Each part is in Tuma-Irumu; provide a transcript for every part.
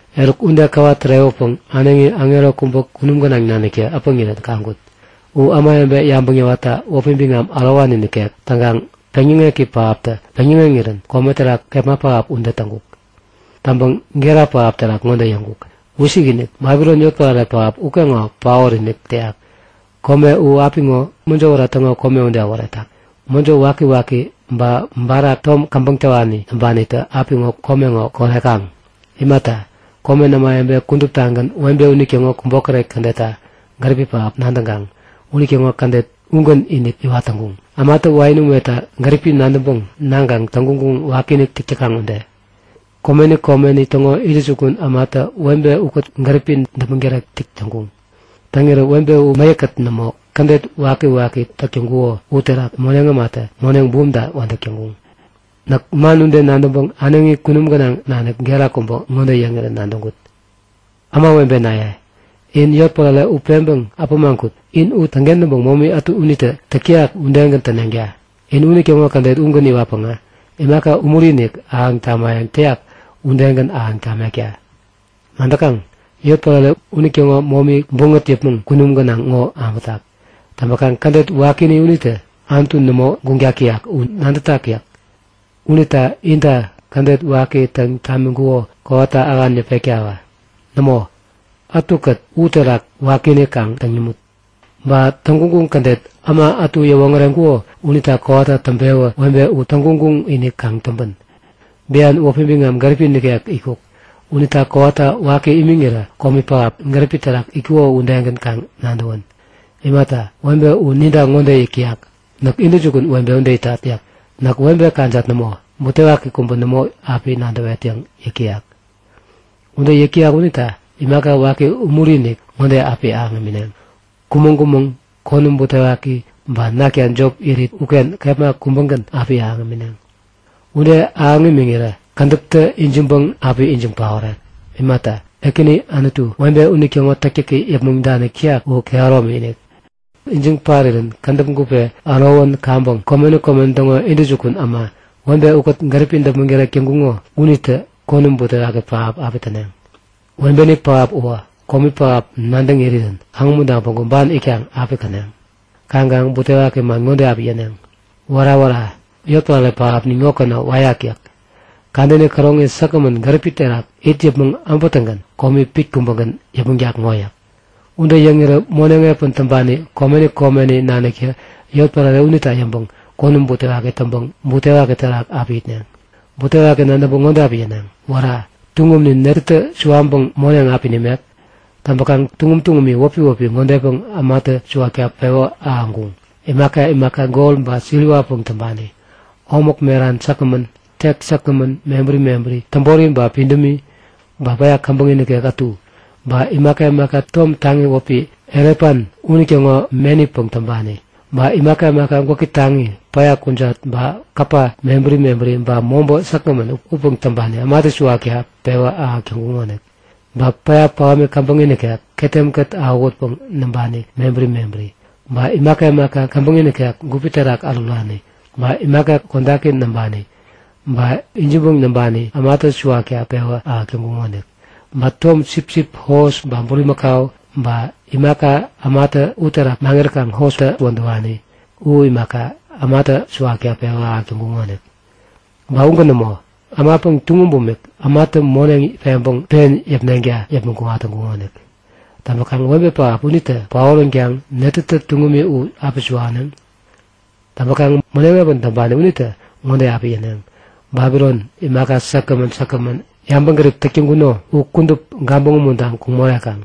Eruk ude käwa tärewäpäŋ äneŋi aŋero kubä kunum gänaŋ naniktä äpäŋirän kaŋkut. U ämawebe yabäŋ yäwatta wäpi biŋam ärowani nikek. Täŋkaŋ peŋyäŋeki pähaptä peŋyäŋeŋirän kome terak kepma pähap ude täŋkuk. Täŋpäŋ gera pähap terak ŋode yäŋkuk; Wisikinik! Babilon yotpärare pähap ukeŋo paot-inik täyak! Kome u apiŋo mäjo wära täŋo kome ude äworetak. Mäjo wakiwaki ba barak tom käbäŋ täwani näŋpanitä apiŋo kome ŋo korekaŋ. Imata, komen ämawebe kuduptagän webe unitäŋo kubokäret kädetta gäripi pähap nadäŋkaŋ unitäŋo kädet ugän-inik iwat täŋkuŋ, ämatä wain umeta gäripi nadäŋpäŋ naŋkaŋ täŋguŋguŋ wakiinik täk täkaŋ ude. Komeni komeni täŋo intäjukun ämatä webe ukät gäripi däpmäŋ tärek täk täŋkuŋ. Täŋirä webe u mäyäk-kät nämo kädet wakiwaki täk täŋkuko uterak moneŋ ämatä moneŋ bumta wädäk täŋkuŋ. Näk man ude nadäŋpäŋ äneŋi kunum gänaŋ nanik gera kubä ŋode yäŋirän nadäŋkut; Ämawebenaye, in yotpärare u peŋpeŋ äpämaŋ kut! In u täŋkentäŋpäŋ momi unitä täk täyak udegän täneŋta. In unitäŋo kädet ugän iwatpäŋä imaka umuri-inik ahäŋ imayäŋ täyak udegän ahäŋ tamekta. Nadäkaŋ? Yotpärare unitäŋo momi buŋät yäpmäŋ kunum gänaŋ ŋo abätak. Täŋpäkaŋ kädet wakini unita Anutu nämo guŋtak täyak u nadätak! yäk. Unita inta kädet waki täŋ tamiŋkuko kowata ähan yäpektawä. Nämo, ätukät uterak wakiinik kaŋ täŋ imut. Ba täŋguŋguŋ kädet äma ätu yäwoŋäreŋkuko unita kowata täŋpewä webe u täŋguŋguŋ-inik kaŋ täŋpän. Bian wäpi biŋam, gäripi nikek itkuk. Unita kowata waki imiŋirä komi pähap, gäripi terak itkuko udegän kaŋ nadäwän. Imata, webe u inita ŋode yäk täyak; Näk intäjukun webe ude itat yäk. Näk webe kajat nämo, butewaki kubä nämo api nadäwet yäŋ yäk täyak. Ude yäk täyak unita imaka waki umuri-inik ŋode api ahäŋ imineŋ; Kumäŋ-kumäŋ, konäm butewaki ba nakta jop irit uken kepma kubägän api ahäŋ imineŋ. Ude ahäŋ imiŋirä kädäptä ijiŋpäŋ api ijiŋ paorek. Imata, Ekäni Anutu, webe unitäŋo täktäki yäpmäŋ danik täyak u kehäromi-inik. Ijiŋ parirän kädäp gupe ärowän kaŋpäŋ komeni komeni täŋo intäjukun äma, webe ukät gäripi däpmäŋ tärek täŋkuŋo unitä konäm butewaki pähap api täneŋ. Webeni pähap uwä komi pähap nadäŋ irirän kaŋumuntaŋ päŋku ban itkaŋ api käneŋ. Kaŋkaŋ butewaki man ŋode api yäneŋ; Wära! Wära! Yotpärare pähapnin ŋokeŋo wäyak yäk. Kadäni käroŋi säkgämän gäripi terak it yäpmäŋ äbätäŋgän komi pit kubägän yäpmäŋtak ŋo yäk. Ude yäŋirä moneŋ epän täŋpani komeni komeni naniktä yotpärare unita yäŋpäŋ konäm butewaki täŋpäŋ butewaki terak api itneŋ. Butewaki nadäŋpäŋ ŋode api yäneŋ; Wära! Tuŋumnin netätä suwaŋpäŋ moneŋ api nimek? Täŋpäkaŋ tuŋum tuŋumi wäpi wäpi ŋodepäŋ ämatä suwakta pewä ahäŋkuŋ; Imaka imaka gol ba siriwapäŋ täŋpani, omäk meran säkgämän, tek säkgämän mebäri mebäri, täbori ba pidämi. Ba päya käbäŋi nikek ätu, ba imaka imaka tom taŋi wäpi elefant unitäŋo menipäŋ täŋpani. Ba imaka imaka gwäki taŋi, päya kujat ba kapa mebäri mebäri ba mobä säkgämän upäŋ täŋpani ämatä suwakta pewä ahäk täŋkuŋonik. Ba päya pähäm käbäŋi nikek, ketem-kät awähutpäŋ näŋpani mebäri mebäri, ba imaka imaka käbäŋi nikek gupi terak ärurani ba imaka kodaki näŋpani ba ijiŋpäŋ näŋpani ämatä suwakta pewä ahäk täŋkuŋonik. Ba tom sipsip, hos ba bulimakau, ba imaka ämatä uterak maŋiräkaŋ hostä wädäwani u imaka, ämatä suwakta pewä ahäk täŋkuŋonik. Ba ugän nämo, ämapäŋ, tuŋum bumik ämatä moneŋ peŋpäŋ pen yäpneŋta yäpmäŋ kuŋat täŋkuŋonik. Täŋpäkaŋ webe pähap unitä paoränkaŋ netätä tuŋumi u api suwaneŋ? Täŋpäŋ moneŋ epän täŋpani unitä ŋode api yäneŋ; Babilon, imaka säkgämän säkgämän yabäŋgärip täk täŋkuno u kudup gabäŋ umuntaŋ kuŋ morekaŋ!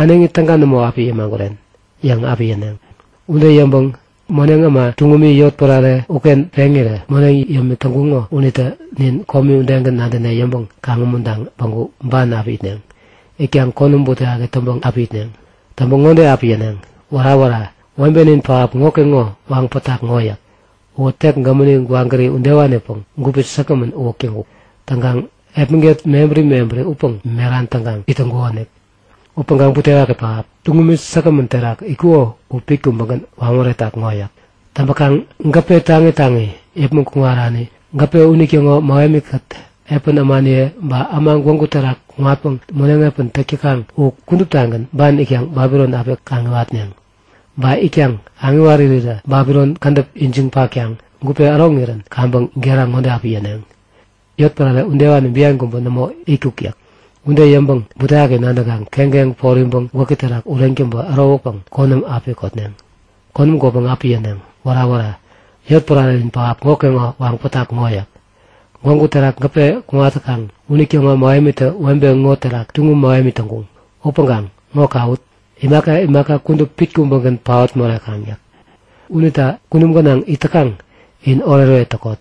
Äneŋi täga nämo api yämaguren! yäŋ api yäneŋ. Ude yäŋpäŋ moneŋ äma tuŋumi yotpärare uken peŋirä moneŋ yämik täŋkuŋo unitä Nin komi udegän nadäne yäŋpäŋ kaŋ-umuntaŋ päŋku ban api itneŋ. Itkaŋ konäm butewaki täŋpäŋ api itneŋ. Täŋpäŋ ŋode api yäneŋ; Wära! Wära! Webenin pähap ŋokeŋo waŋ pätak ŋo yäk. Uwä tek gämäni gwagäri udewanipäŋ gupi säkgämän uwäk täŋkuk. Täŋkaŋ epmäget mebäri mebäri upäŋ meran täŋkaŋ it täyakonik. Upäŋkaŋ butewaki pähap! Tuŋumi säkgämän terak itkuko u pit kubägän waŋ moretak ŋo yäk. Täŋpäkaŋ gäpe taŋi taŋi yäpmäŋ kuŋarani, gäpe unitäŋo mähemikät epän ämaniye, ba äma gwägu terak kuŋatpäŋ moneŋ epän täk täkaŋ u kuduptagän ban itkaŋ Babilon api kaŋiwat itneŋ. Ban itkaŋ kaŋiwarirä Babilon kädäp ijiŋ patkaŋ gupe äroŋirän kaŋpäŋ gera ŋode api yäneŋ; Yotpärare udewani bian kubä nämo itkuk yäk. Ude yäŋpäŋ butewaki nadäŋkaŋ keŋkeŋ poriŋpäŋ gwäki terak ureŋ täŋpä ärowäpäŋ konäm api kotneŋ. Konäm kotpäŋ api yäneŋ; Wära! Wära! Yotpärarenin pähap ŋokeŋo waŋ pätak ŋo yäk. Gwägu terak gäpe kuŋat täkaŋ unitäŋo mähemitä webe ŋo terak tuŋum mähemi täŋkuŋ. Upäŋkaŋ ŋo kawut! Imaka imaka kudup pit kubägän paot morekaŋ yäk. Unita kunum gänaŋ it täkaŋ, in oretoret täkot!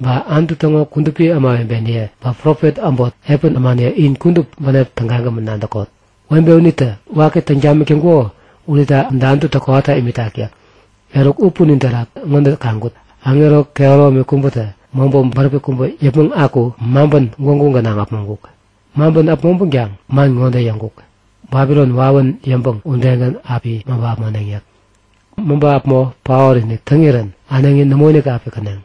Ba Anutu täŋo kudupi ämawebeniye, ba profet äbot, epän ämaniye in kudup bänep tägagämän nadäkot! Webe unitä waki täŋ tamik täŋkuko unita Anututä kowata imitak yäk. Eruk u punin terak ŋode kaŋkut; Aŋero kehäromi kubätä mobä bäräpi kubä yäpmäŋ aku maŋpän gwägu gänaŋ äpmoŋkuk. Maŋpän äpmoŋpänkaŋ man ŋode yäŋkuk; Babilon wawän yäŋpäŋ udegän api maŋpä äpmoneŋ yäk. Maŋpä äpmo paot-inik täŋirän äneŋi nämoinik api käneŋ.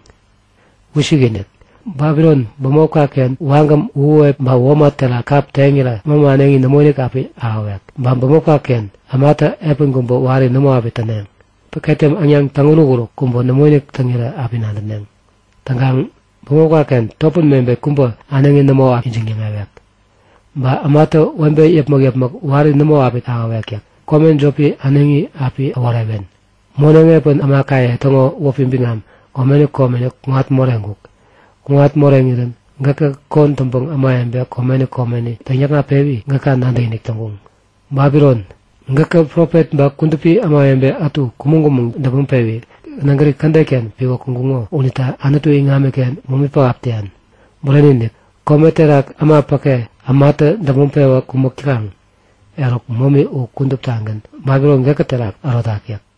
Wisikinik! Babilon bämopka-ken wagäm, uhuwep, ba womat terak kap teŋirä mämä äneŋi nämoinik api ahäwek. Ba bämopka-ken ämatä epän kubä wari nämo api täneŋ. Ba ketem äŋnaŋ täŋuruk-uruk kubä nämoinik täŋirä api nadäneŋ. Täŋkaŋ bämopka-ken topän mebet kubä äneŋi nämo api ijiŋ-yäŋewek. Ba ämatä webe yäpmäk-yäpmäk wari nämo api ahäwek yäk. Kome jopi äneŋi api äworewen. Moneŋ epän ämakaye täŋo wäpi biŋam komeni komeni kuŋat moreŋkuk. Kuŋat moreŋirän gäkä kon täŋpäŋ ämawebe komeni komeni täŋyäkŋatpewi gäka nadäkinik täŋkuŋ. Babilon, gäkä profet ba kudupi ämawebe ätu kumäŋ-kumäŋ däpmäŋ-pewi nägäri kädet-ken piwä kuŋkuŋo unita Anutu iŋamiken momi pähap täyan. Bureni-inik, kome terak äma päke ämatä däpmäŋ-pewä kumäk täkaŋ, eruk momi u kuduptagän Babilon gäkä terak ärotak yäk.